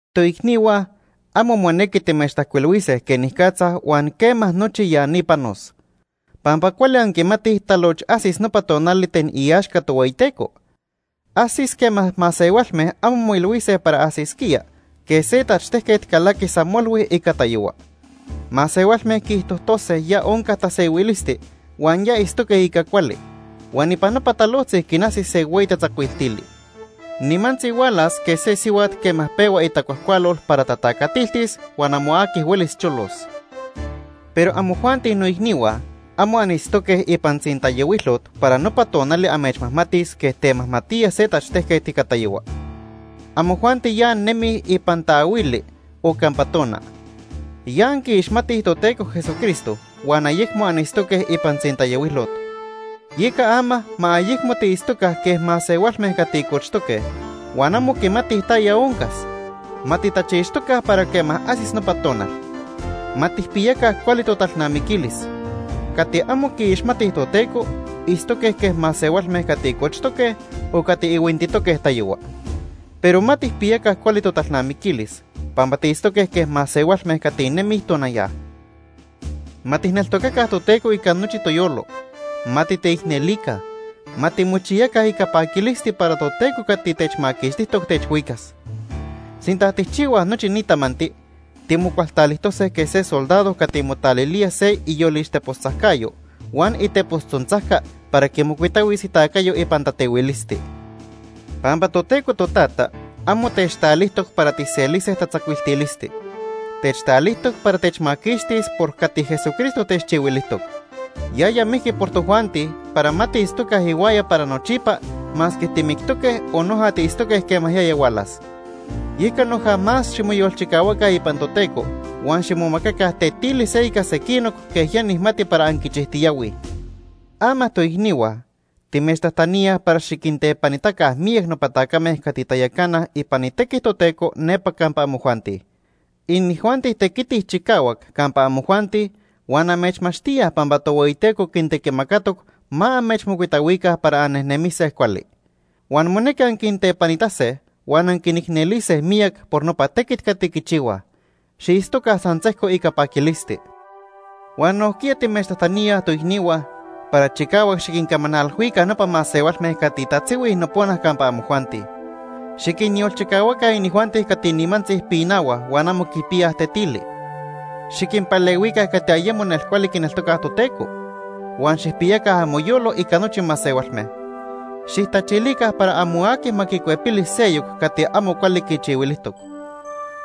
Toicnihua, amo monequi timechtajcuilhuise quenicatza huan quema nochi ya ni panos. Pampa cuali anquimatij taloch ajsis nopa tonali ten iaxca Tohueyiteco. Ajsis quema masehualme amo moilhuise para ajsisquía, quej se tachtejquet calaqui san nima ica tayohua. Masehualme quiijtojtose ya onca tasehuilisti huan ya itztoque ica cuali, huan ipan nopa talojtzi quinajsis se hueyi tatzacuiltili. Nimantzi hualas quej se sihuat quema pehua itacuajcualol para tatacatiltis huan amo aqui huelis cholos. Pero amojuanti noicnihua, amo anitztoque ipan tzintayohuilot para nopa tonali amechmajmatis quej tamajmatía se tachtejquet ica tayohua. Amojuanti ya annejnemij ipan taahuili o campa tona. Ya anquiixmatij Toteco Jesucristo huan ayecmo anitztoque ipan tzintayohuilot. Yeca ama ma ayecmo tiitztoca quej masehualme cati cochtoque huan amo quimatij taya oncas. Ma titachixtoca para quema ajsis nopa tonal. Ma tijpiyaca cuali totalnamiquilis. Cati amo quiixmatij Toteco itztoque quej masehualme cati cochtoque o cati ihuintitoque tayohua. Pero ma tijpiyaca cuali totalnamiquilis pampa tiitztoque quej masehualme cati nemij tonaya. Ma tijneltocaca Toteco ica nochi toyolo. Ma titeicnelica. Ma timochiyaca ica paquilisti para Toteco cati techmaquixtijtoc techhuicas. Sinta tijchihuaj nochi ni tamanti, timocualtalijtose quej se soldado cati motalilía se iyolixtepos tzajcayo huan itepos tzontzajca para quimocuitahuis itacayo ipan tatehuilisti. Pampa Toteco Totata amo techtalijtoc para tijselise tatzacuiltilisti. Techtalijtoc para techmaquixtis por cati Jesucristo techchihuilijtoc. Yaya mijqui por tojuanti para ma tiitztoca ihuaya para nochipa masque timictoque o noja tiitztoque quema yaya hualas. Yeca noja más ximoyolchicahuaca ipan Toteco huan ximomacaca tetili se ica sequinoc quej ya nijmati para anquichijtiyahuij. Ama toicnihua, timechtajtaníaj para xiquintepanitaca miyac nopa tacame cati tayacanaj ipan itequi Toteco nepa campa amojuanti. Inijuanti tequitij chicahuac campa amojuanti huan amechmachtíaj pampa Tohueyiteco quintequimacatoc ma amechmocuitahuica para annejnemise cuali. Huan monequi anquintepanitase huan anquinicnelise miyac por nopa tequit cati quichihuaj. Xiitztoca san sejco ica paquilisti. Huan nojquiya timechtajtaníaj, toicnihua, para chicahuac xiquincamanalhuica nopa masehualme cati tatzihuij nopona campa amojuanti. Xiquinyolchicahuaca inijuanti cati nimantzi pinahuaj huan amo quipiyaj tetili. Xiquinpalehuica cati ayemo nelcuali quineltocaj Toteco. Huan xijpiyaca amoyolo ica nochi masehualme. Xijtachilica para amo aqui ma quicuepili seyoc cati amo cuali quichihuilijtoc.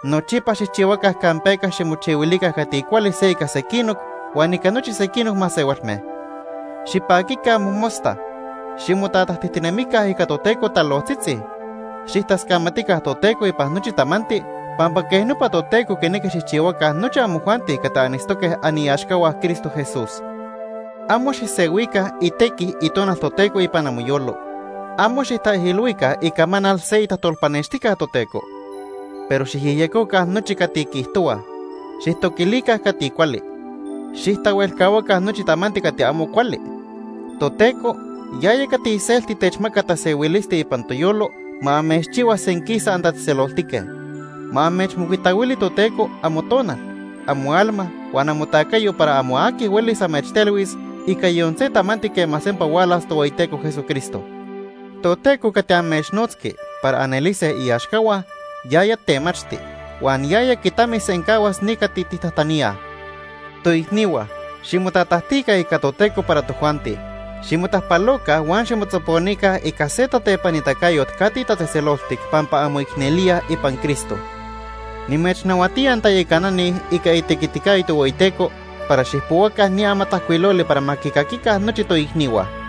Nochipa xijchihuaca campeca ximochihuilica cati cuali se ica sequinoc huan ica nochi sequinoc masehualme. Xipaquica mojmosta. Ximotatajtijtinemica ica Toteco talojtzitzi. Xijtascamatica Toteco ipan nochi tamanti pampa quej nopa Toteco quinequi xijchihuaca nochi amojuanti cati anitztoque aniaxcahua Cristo Jesús. Amo xijsehuica itequi Itonal Toteco ipan amoyolo. Amo xijtaijilhuica icamanal se tajtolpanextijquet Toteco. Pero xijyejyecoca nochi cati quiijtohuaj. Xijtoquilica cati cuali. Xijtahuelcahuaca nochi tamanti cati amo cuali. Toteco, yaya cati iselti techmaca tasehuilisti ipan toyolo, ma amechchihua senquisa antatzejtzeloltique. Ma amechmocuitahuili Toteco amotonal, amoalma, huan amotacayo para amo aqui huelis amechtelhuis ica yon se tamanti quema sempa hualas Tohueyiteco Jesucristo. Toteco cati amechnotzqui para anelise iaxcahua, yaya temachti. Huan yaya quitamisencahuas ni cati tijtajtaníaj. Toicnihua, ximotatajtica ica Toteco para tojuanti. Ximotajpaloca huan ximotzoponica ica se tatepanitacayot cati tatzejtzeloltic pampa anmoicnelíaj ipan Cristo. Nimechnahuatía antayacanani ica itequiticayo Tohueyiteco para xijpohuaca ni amatajcuiloli para ma quicaquica nochi toicnihua.